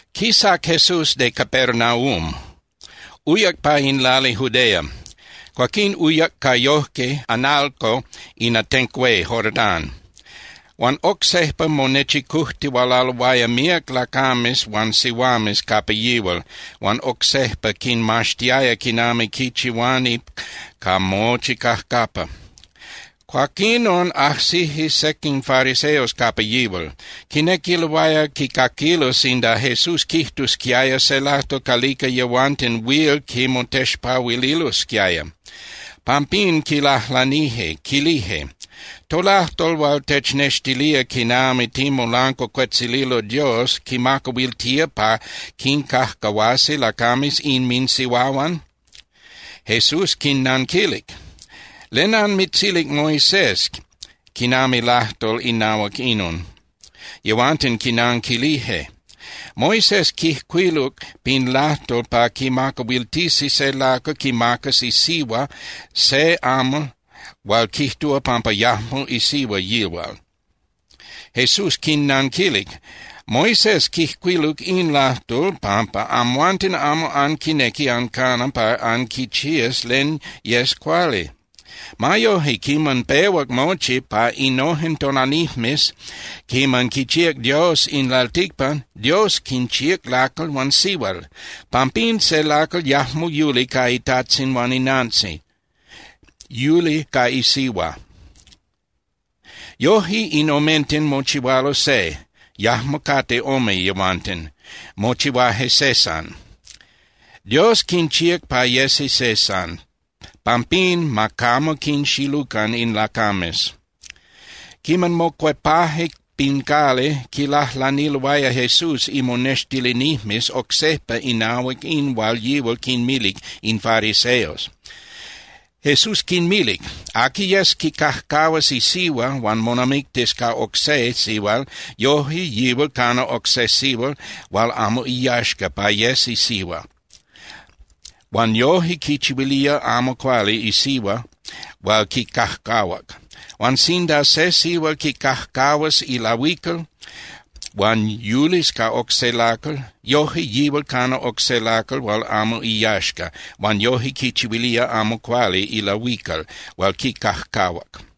Quisac Jesús de Capernaum, uyac pa in lali Judea. Cuaquín uyac ca yojque (analco) in atenco hué Jordán. Huan oc sejpa monechicujtihualaloaya míac lacames huan sihuames capa yihual, huan oc sejpa quinmaxtiaya quinami quichihuani ca mochi cajcapa. Cuaquinon ajsije sequin fariseos capa yihual. Quinequiloaya quicaquilo sinda Jesús quijtusquiaya se lajtol calica yehuanten huil quimotexpahuililosquiaya. Pampín quilajlanije, quilije: —¿Tolajtol hual technextilía quinami ticmolancuacuetzililo Dios quimacahuiltía pa quincajcahuasi lacames inminsihuahuan? Jesús quinnanquilic: —¿Len anmitzilic Moisés quinami lajtol inahuac inon? Yehuanten quinanquilije: —Moisés quijcuiluc pin lajtol pa quimacahuiltisi se lacal quimacas isihua se amal hual quijtúa pampa yajmo isihua yihual. Jesús quinnanquilic: —Moisés quijcuiluc in lajtol pampa amhuanten amo anquinequi ancana pa anquichías len yes cuali. Ma yoje, quiman pehuac mochi, pa innojen tonalijmes quiman quichíac Dios in lalticpan, Dios quinchíac lacal huan sihual. “Pampín se lacal yajmo yuli ca itajtzin huan inantzin, yuli ca isihua. Yoje in omenten mochihualo se, yajmo cate ome yehuanten, mochihuaje se san.” Dios quinchíac pa yesi se san. Pampín ma camo quinxilucan in lacames. Quiman mocuepaje pin cali, quilajlaniloaya Jesús imonextilinijmes oc sejpa inahuac in hual yihual quinmilic in fariseos. Jesús quinmilic: —Aqui yes quicajcahuas isihua huan monamictis ca oc se sihual, yoje yihual cana oc se sihual hual amo iyaxca pa yes isihua huan yoje quichihuilía amo cuali isihua hual quicajcahuac. Huan sinda se sihual quicajcahuas ilahuical huan yulis ca oc se lacal, yoje yihual cana oc se lacal hual amo iyaxca huan yoje quichihuilía amo cuali ilahuical hual quicajcahuac.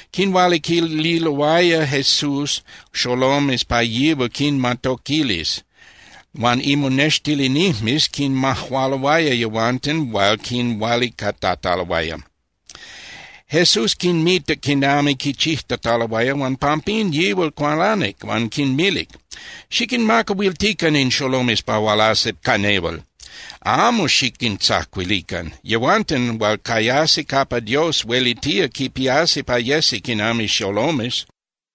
Quinhualiquililoaya Jesús xolomes pa yihual quinmatoquilis, huan imonextilinijmes quinmajualoaya yehuanten hual quinhualicatataloaya. Jesús quinmitac quinami quichijtataloaya, huan pampín yihual cualanic huan quinmilic: —Xiquinmacahuiltican in xolomes pa hualasi ca nehual, amo xiquintzacuilican. Yehuanten hual cayasi capa Dios huelitía quipiasi pa yesi quinami xolomes.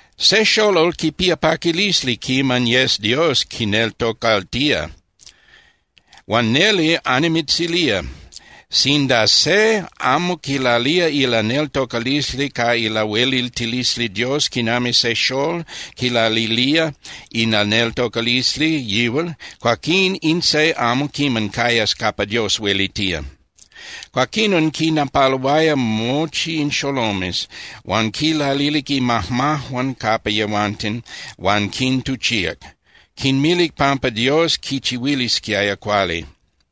Se xolol quipía paquilisli quiman yes Dios quineltocaltía. Huan neli annimitzilía, sinda se amo quilalía ilaneltocalisli ca ilahueliltilisli Dios quinami se xól quilalilía ilaneltocalisli yihual, cuaquín in se amo quiman cayas capa Dios huelitía. Cuaquinon quinnapaluaya mochi in xolomes, huan quinlalilic imajmajuan capa yehuanten huan quintuchíac, quinmilic pampa Dios quinchihuilisquiaya cuali.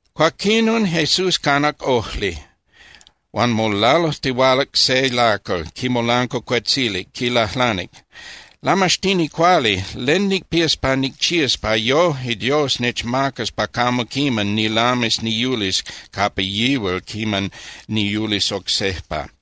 Cuaquinon Jesús canac ojli. Huan molalujtihualac se lacal, quimolancuacuetzilic, quilajlanic: —Lamaxtini cuali, ¿len nicpías pa nicchías pa yojque Dios nechmacas pa camo quiman nilamis niyulis capa yihual quiman niyulis oc sejpa?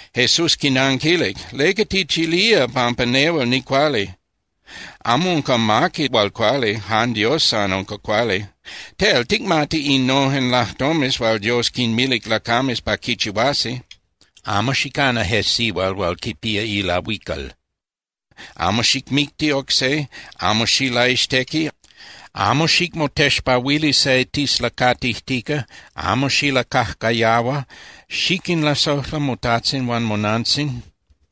Jesús quinanquilic: —¿Leca tichilía pampa nehual nicuali? Amo unca amaqui hual cuali, jan Dios san unca cuali. Tel, ticmati innojen lajtomes hual Dios quinmilic lacames pa quichihuasi: “Amo xicana je sihual hual quipía ilahuical, amo xicmicti oc se, amo xilaixtequi, amo xicmotexpahuili se tislacatijtica, xiquinlasojla motajtzin huan monantzin.”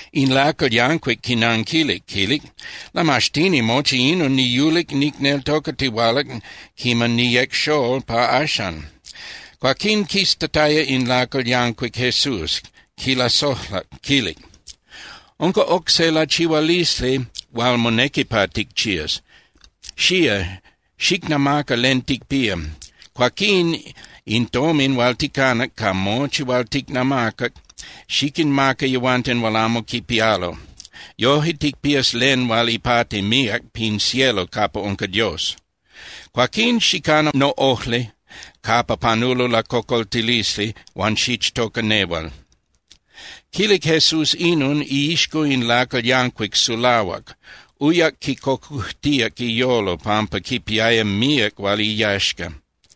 In lacal yancuic quinanquilic, quilic: —Lamaxtini, mochi inon niyulic nicneltocatihualac quiman niyec xól pa axan. Cuaquín quiztataya in lacal yancuic Jesús, quilasojlac, quilic: —Unca oc se lachihualisli hual monequi pa ticchías. Xía, xicnamaca len ticpía. Cuaquín in tomin hual ticanac ca mochi hual ticnamacac xiquinmaca yehuanten hual amo quipialo. Yoje ticpías len hual ipati míac pin cielo capa unca Dios. Cuaquín xicana noꞌojli capa panulo lacocoltilisli huan xichtoca nehual. Quilic Jesús inon, iixco in lacal yancuic sulahuac, uyac quicocujtíac iyolo pampa quipiaya míac hual iyaxca.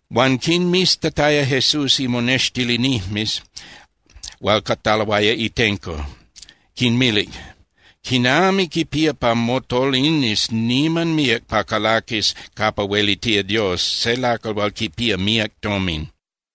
Huan quinmiztataya Jesús imonextilinijmes hual cataloaya itenco, quinmilic: —¡Quinami quipía pa motolinis niman míac pa calaquis capa huelitía Dios se lacal hual quipía míac tomin!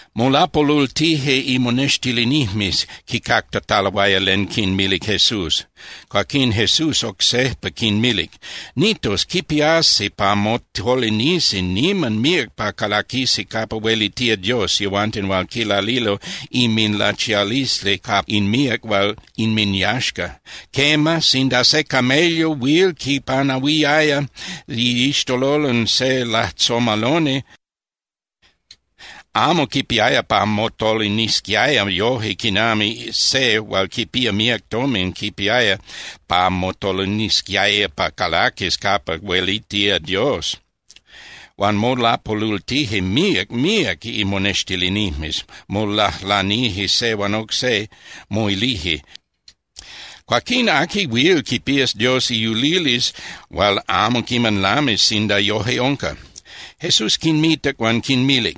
Molapolultije imonextilinijmes quicactataloaya len quinmilic Jesús. Cuaquín Jesús oc sejpa quinmilic: —Nitos, quipiasi pa motolinisi niman míac pa calaquisi capa huelitía Dios yehuanten hual quilalilo inminlachialisli ca in míac hual inminyaxca. Quema, sinda se camello huil quipanahuiaya iixtololon se lajtzomaloni, amo quipiaya pa motolinisquiaya yoje quinami se hual quipía míac tomin quipiaya pa motolinisquiaya pa calaquis capa huelitía Dios. Huan molapolultije míac míac imonextilinijmes, molajlanije se huan oc se, moilije: —Cuaquín ¿aqui huil quipías Dios iyulilisli hual amo quiman lamis sinda yoje unca? Jesús quinmitac huan quinmilic: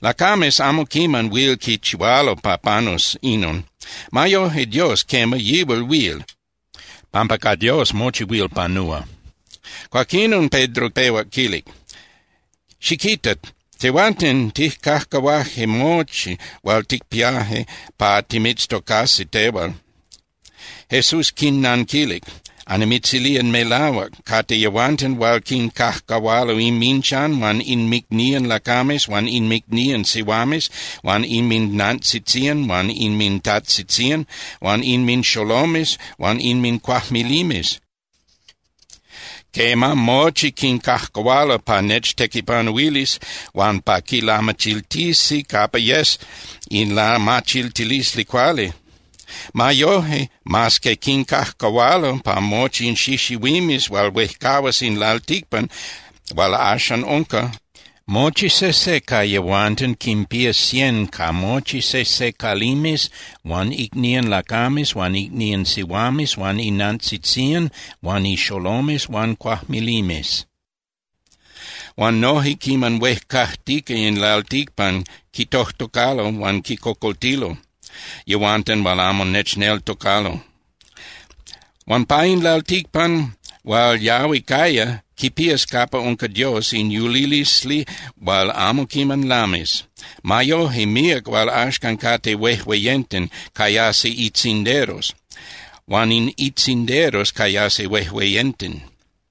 —Lacames amo quiman huil quichihualo pa panus inon. Ma yoje, Dios, quema, yihual huil, pampa ca Dios mochi huil panúa. Cuaquinon Pedro pehuac quilic: —Xiquita. Tehuanten tijcajcahuaje mochi hual ticpiaje pa timitztocasi tehual. Jesús quinnanquilic: —Annimitzilía melahuac. Cate yehuanten hual quincajcahualo inminchan huan inmicnían lacames huan inmicnían sihuames huan inminnantzitzían huan inmintajtzitzían huan inminxolomes huan inmincuajmilimes. Quema, mochi quincajcahualo pa nechtequipanuilis huan pa quilamachiltisi capa yes in lamachiltilisli cuali. Ma yoje, mas que quincajcahualo, pa mochi in xixihuimes hual huejcahuas in lalticpan hual axan unca, mochi sejse ca yehuanten quinpías cien ca mochi sejse calimes huan icnían lacames huan icnían sihuames huan inantzitzían huan ixolomes huan cuajmilimes. Huan noje quiman huejcajtica in lalticpan, quitojtocalo huan quicocoltilo yehuanten hual amo nechneltocalo. Huan pa in lalticpan hual yahui caya, quipías capa unca Dios in yulilisli hual amo quiman lamis. Ma yoje, míac hual axan cate huejueyenten cayasi itzinderos, huan in itzinderos cayasi huejueyenten.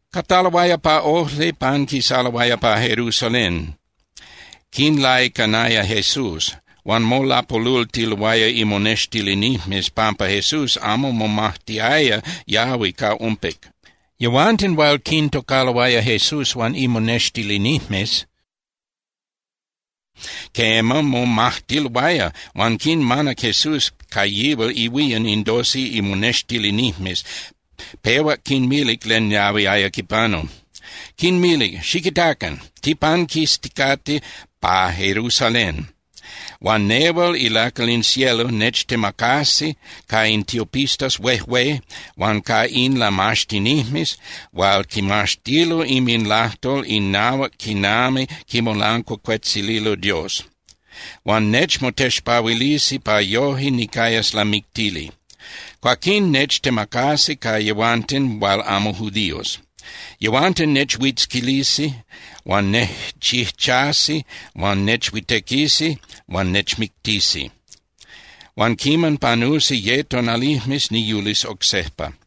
Cataloaya pa ojli, panquisaloaya pa Jerusalén, quinlaicanaya Jesús. Huan molapolultiloaya imonextilinijmes pampa Jesús amo momajtiaya yahui ca ompic. Yehuanten hual quintocaloaya Jesús huan imonextilinijmes, quema, momajtiloaya. Huan quinmanac Jesús ca yihual ihuían in doce imonextilinijmes, pehuac quinmilic len yahuiaya quipanu. Quinmilic: —Xiquitacan. Tipanquisticate pa Jerusalén, huan nehual ilacal in cielo nechtemacasi ca in tiopistas huejué huan ca in lamaxtinijmes hual quimaxtilo inminlajtol inahuac quinami quimolancuacuetzililo Dios. Huan nechmotexpahuilisi pa yoje nicayas lamictili. Cuaquín nechtemacasi ca yehuanten hual amo judíos. Yehuanten nechhuitzquilisi huan nejchijchasi huan nechhuitequisi huan nechmictisi. Huan quiman panusi ye tonalijmes, niyulis oc sejpa.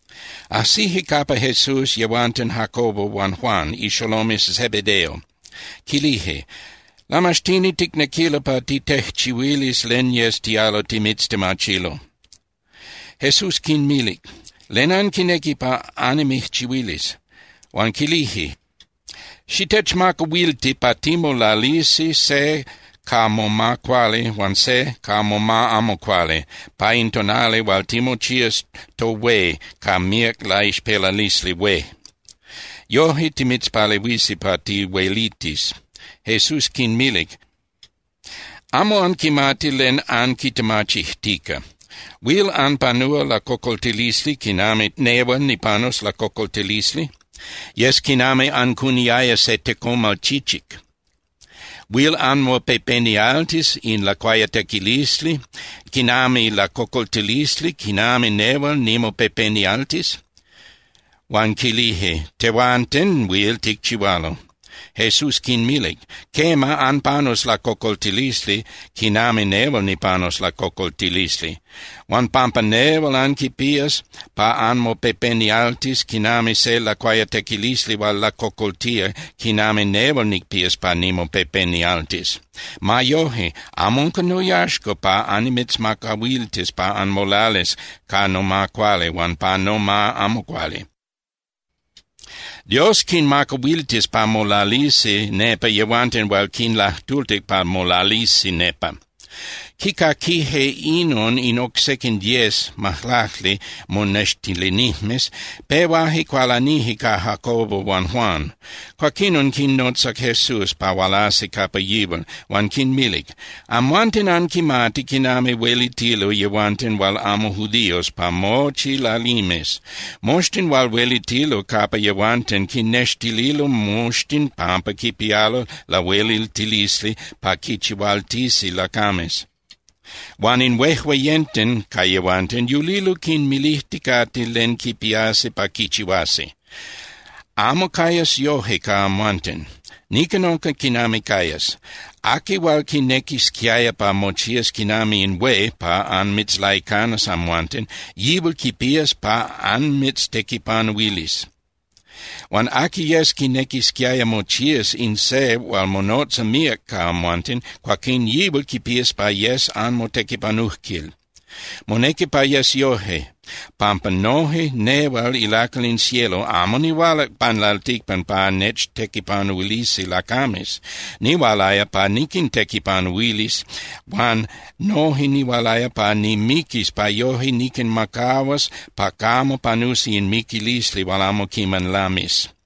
Ajsije capa Jesús yehuanten Jacobo huan Juan, ixolomes Zebedeo, quilije: —Lamaxtini, ticnequilo pa titejchihuilis len yes tialo timitztemachilo. Jesús quinmilic: —¿Len anquinequi pa annimijchihuilis? Huan quilije: —Xitechmacahuilti pa timolalisi se ca moma cuali huan se ca moma amo cuali pa in tonali hual timochías tohué ca míac laixpelalisli hué. Yoje timitzpalehuisi pa tihuelitis. Jesús quinmilic: —Amo anquimati len anquitemachijtica. ¿Huil anpanúa lacocoltilisli quinami nehual nipanus lacocoltilisli? Yes quinami ancuniaya se tecomal chichic. ¿Huil anmopepenialtis in lacuayatequilisli quinami lacocoltilisli quinami nehual nimopepenialtis? Huan quilije: —Tehuanten huil ticchihualo. Jesús quinmilic: —Quema, anpanus lacocoltilisli quinami nehual nipanus lacocoltilisli. Huan pampa nehual anquipías pa anmopepenialtis quinami se lacuayatequilisli hual lacocoltía quinami nehual nicpías pa nimopepenialtis. Ma yoje, amo unca noyaxca pa annimitzmacahuiltis pa anmolalis ca noma cuali huan pa noma amo cuali. Dios quinmacahuiltis pa molalisi nepa yehuanten hual quinlajtultic pa molalisi nepa. Quicaquije inon in oc sequin diez (majlacli) monextilinijmes, pehuaje cualanije ca Jacobo huan Juan. Cuaquinon quinnotzac Jesús pa hualasi capa yihual, huan quinmilic: —Amhuanten anquimati quinami huelitilo yehuanten hual amo judíos pa mochi lalimes. Moxtin hual huelitilo capa yehuanten quinnextilo moxtin pampa quipialo lahueliltilisli pa quinchihualtisi lacames. Huan in huejueyenten ca yehuanten yulilo quinmilijticate len quipiasi pa quichihuasi. ’Amo cayas yoje ca amhuanten. Nican unca quinami cayas: Aqui hual quinequisquiaya pa mochías quinami in hué pa anmitzlaicanas amhuanten, yihual quipías pa anmitztequipanuilis. Huan aqui yes quinequisquiaya mochías in se hual monotza míac ca amhuanten, cuaquín yihual quipías pa yes anmotequipanujquil. Monequi pa yes yoje, pampa noje nehual ilacal in cielo amo nihualac pan lalticpan pa nechtequipanuilisi lacames. Nihualaya pa niquintequipanuilis huan noje nihualaya pa nimiquis pa yoje niquinmacahuas pa camo panusi in miquilisli hual amo quiman lamis.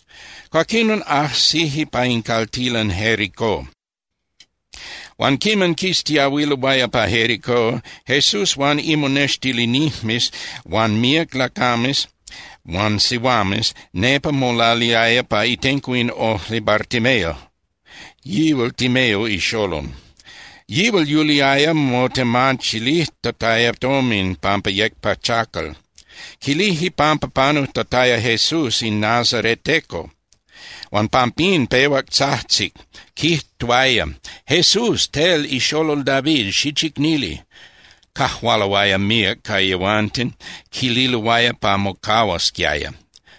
Cuaquinon ajsije pa in caltilan Jericó. Huan quiman quistiahuiloaya pa Jericó Jesús huan imonextilinijmes huan míac lacames huan sihuames, nepa molaliaya pa itenco in ojli Bartimeo, yihual Timeo ixolol. Yihual yuliaya motemachilijtataya tomin pampa yec pachacal. Quilije pampa panujtataya Jesús in nazareteco, huan pampín pehuac tzajtzic, quijtuaya: —¡Jesús, tel ixolol David, xichicnili! Cajualoaya míac ca yehuanten, quililoaya pa mocahuasquiaya.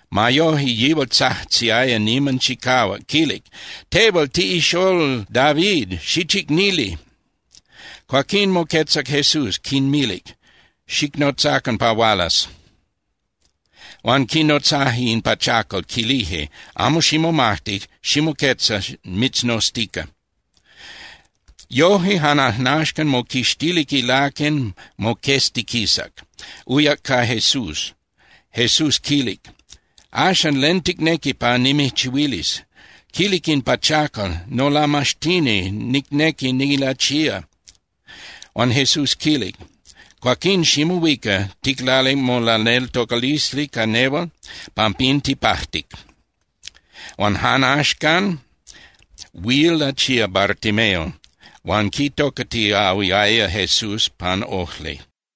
Ma yoje, yihual tzajtziaya niman chicahuac, quilic: —¡Tehual tiꞌixolol David, xichicnili! Cuaquín moquetzac Jesús, quinmilic: —Xicnotzacan pa hualas. Huan quinotzaje in pachacal, quilije: —Amo ximomajti, ximoquetza, mitznoztica. Yoje jan ajnaxcan moquixtilic ilaquen moqueztiquisac, uyac ca Jesús. Jesús quilic: —Axan, ¿len ticnequi pa nimijchihuilis? Quilic in pachacal: —Nolamaxtini, nicnequi nilachía. Huan Jesús quilic: —Cuaquín ximohuica. Ticlalic molaneltocalisli ca nehual, pampín tipajtic. Huan jan ajnaxcan huil lachíac Bartimeo huan quitocatiahuiaya Jesús pan ojli.